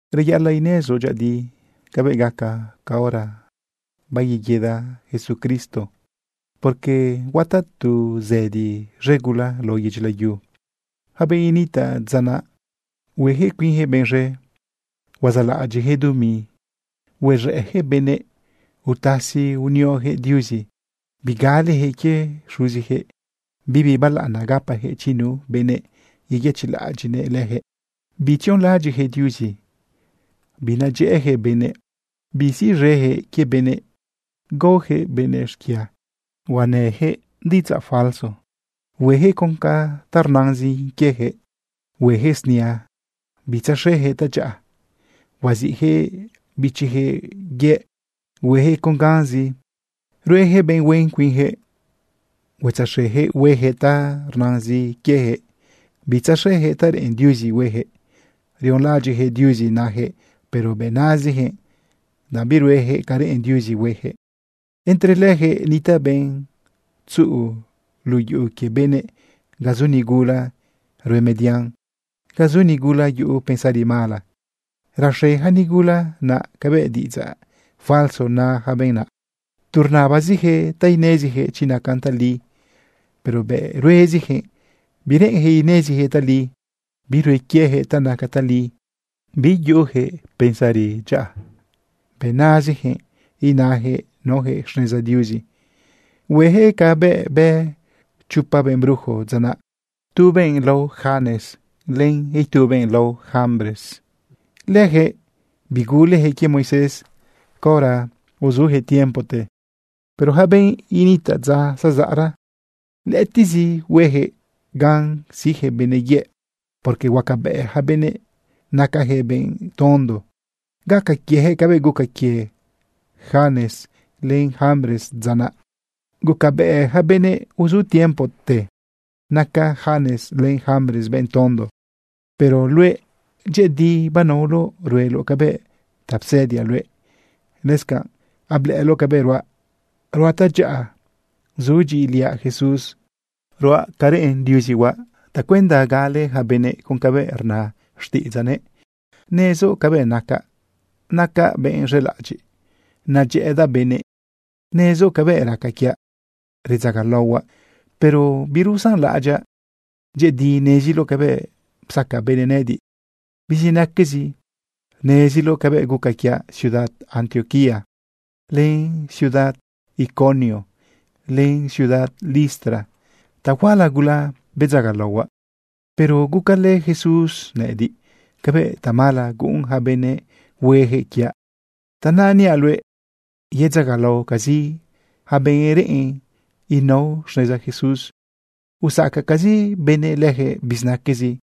Reyaꞌalaꞌ inezoꞌ dyëꞌëdi cabëꞌ gaca caora bayeguida Jesucristo, porque huataꞌ tu zëdi z̃e gula lao yedyi layu. Yaca benꞌ initaꞌ dza naꞌ, huejëꞌ cuinjëꞌ benꞌ z̃e, huazaꞌlaꞌadyiꞌyaquëꞌ dumi, uz̃ëꞌyaquëꞌ benëꞌ, utasi unioyaquëꞌ Diuzi, bigaleyaquëꞌ quie xuziyaquëꞌ, bibi balaꞌana gapayaquëꞌ chi nu benëꞌ yeyëchiꞌlaꞌadyiꞌnëꞌ leyaquëꞌ, bitzionlaꞌadyiꞌyaquëꞌ Diuzi. Binadyëꞌëyaquëꞌ benëꞌ, bisiꞌz̃eyaquëꞌ quie benëꞌ, gaoyaquëꞌ benëꞌ xquia rnayaquëꞌ diꞌidzaꞌ falso, hueyaquëꞌ con ta rnazin quieyaquëꞌ, hueyaquëꞌ snia, bitzaxeyaquëꞌ tadyaꞌa. Huaziꞌyaquëꞌ bichiyaquëꞌ yëꞌ, hueyaquëꞌ con ganzi, rueyaquëꞌ benꞌ huen cuinyaquëꞌ, huatzaxejëꞌ huejëꞌ ta rnazin quiejëꞌ, bitzaxeyaquëꞌ ta reꞌen Diuzi hueyaquëꞌ. Rionlaꞌadyiꞌjëꞌ Diuzi najëꞌ, pero bëꞌ nazijëꞌ, danꞌ birueyaquëꞌ ca reꞌen Diuzi hueyaquëꞌ. Entre leyaquëꞌ nitaꞌ benꞌ tzuꞌu luꞌu yuꞌu quie benëꞌ ga zu nigula rue median, ga zu nigula yuꞌu pensari mala. Raxe yaca nigula naꞌ cabëꞌ diꞌidzaꞌ falso na yaca benꞌ naꞌ. Tu rnabaziyaquëꞌ ta ineziyaquëꞌ chi nacan tali, pero bëꞌ ruezijëꞌ bireꞌenjëꞌ inezijëꞌ tali. Birue quieyaquëꞌ ta naca tali. Bitzuꞌuyaquëꞌ pensari dyaꞌa. Bëꞌ nazijëꞌ inajëꞌ naojëꞌ xneza Diuzi. Hueyaquëꞌ cabëꞌ bë chopa benꞌ brujo dza naꞌ, tu benꞌ lao Janes len itu benꞌ lao Jambres. Leyaquëꞌ biguleyaquëꞌ quie Moisés caora uzuyaquëꞌ tiempote. Pero yaca benꞌ initaꞌ dza zazaꞌra, lëꞌëtiꞌzi hueyaquëꞌ gan siꞌjëꞌ benëꞌ yëꞌ, porque huacabëꞌ yaca benëꞌ nacajëꞌ benꞌ tondo. Gaca quieyaquëꞌ cabëꞌ guca quie Janes len Jambres dza naꞌ. Gucabëꞌ yaca benëꞌ uzu tiempote naca Janes len Jambres benꞌ tondo. Pero luëꞌ, dyëꞌëdi banaoloꞌ rueloꞌ cabëꞌ ta psëdiaꞌ luëꞌ. Lëscanꞌ ablëꞌëloꞌ cabëꞌ ruaꞌ, ruaꞌ tadyaꞌa, zudyiꞌiliaꞌ Jesús, ruaꞌ ca reꞌen Diuzi huaꞌ tacuenda gale ja benëꞌ con cabëꞌ rna xtiꞌidzaꞌnëꞌ. Nezoꞌ cabëꞌ nacaꞌ, nacaꞌ benꞌ z̃elaꞌadyiꞌ, nadyëꞌëdaꞌ benëꞌ. Nezoꞌ cabëꞌ raca quiaꞌ redzagalaohuaꞌ, pero birusanlaꞌadyaꞌ. Dyëꞌëdi neziloꞌ cabëꞌ psaca benëꞌ nëꞌëdiꞌ bizinaquezi. Neziloꞌ cabëꞌ guca quiaꞌ ciudad Antioquía, len ciudad Iconio, len ciudad Listra. Tahuala gula bedzagalaohuaꞌ, pero gucalë Jesús nëꞌëdiꞌ cabëꞌ tamala guꞌun yaca benëꞌ huejëꞌ quiaꞌ. Tanaꞌ niaꞌ luëꞌ yedzagalaocazi yaca benꞌ reꞌen enao xneza Jesús. Usacacazi benëꞌ lëjëꞌ bizinaquezi.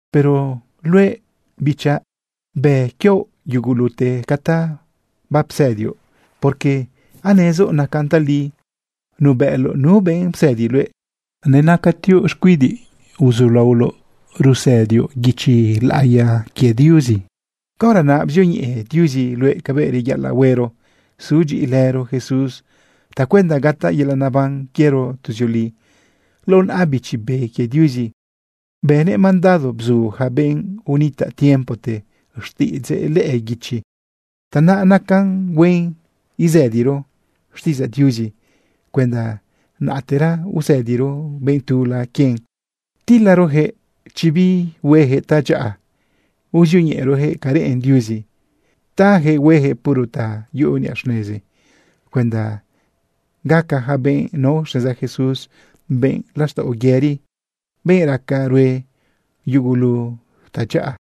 Pero luëꞌ, bichaꞌ, bë quioꞌ yugulute ca ta bapsëdioꞌ, porque anezoꞌ nacan tali, nuebëꞌloꞌ nu benꞌ psëdi luëꞌ. Nenacatioꞌ xcuidiꞌ uzulaoloꞌ rusëdioꞌ guichi laꞌiya quie Diuzi. Caora naꞌ bzioñeꞌe Diuzi luëꞌ cabëꞌ reyaꞌalaꞌ huero sudyiꞌilëro Jesús tacuenda gataꞌ yelaꞌ neban quiero tuzioli. Lao naꞌa Bichi Be quie Diuzi bënëꞌ mandado bzu yaca benꞌ unitaꞌ tiempote xtiꞌidzëꞌ lëꞌë guichi. Tanaꞌ nacan huen isëdiro xtiꞌidzaꞌ Diuzi cuenda naꞌtera usëdiro benꞌ tula quien, tilarojëꞌ chi bihuejëꞌ tadyaꞌa, uzioñeꞌerojëꞌ ca reꞌen Diuzi tajëꞌ huejëꞌ puro ta yuꞌu niꞌa xnezi cuenda gaca yaca benꞌ nao xneza Jesús benꞌ laxtaꞌo yëri, benꞌ raca rue yugulu tadyaꞌa.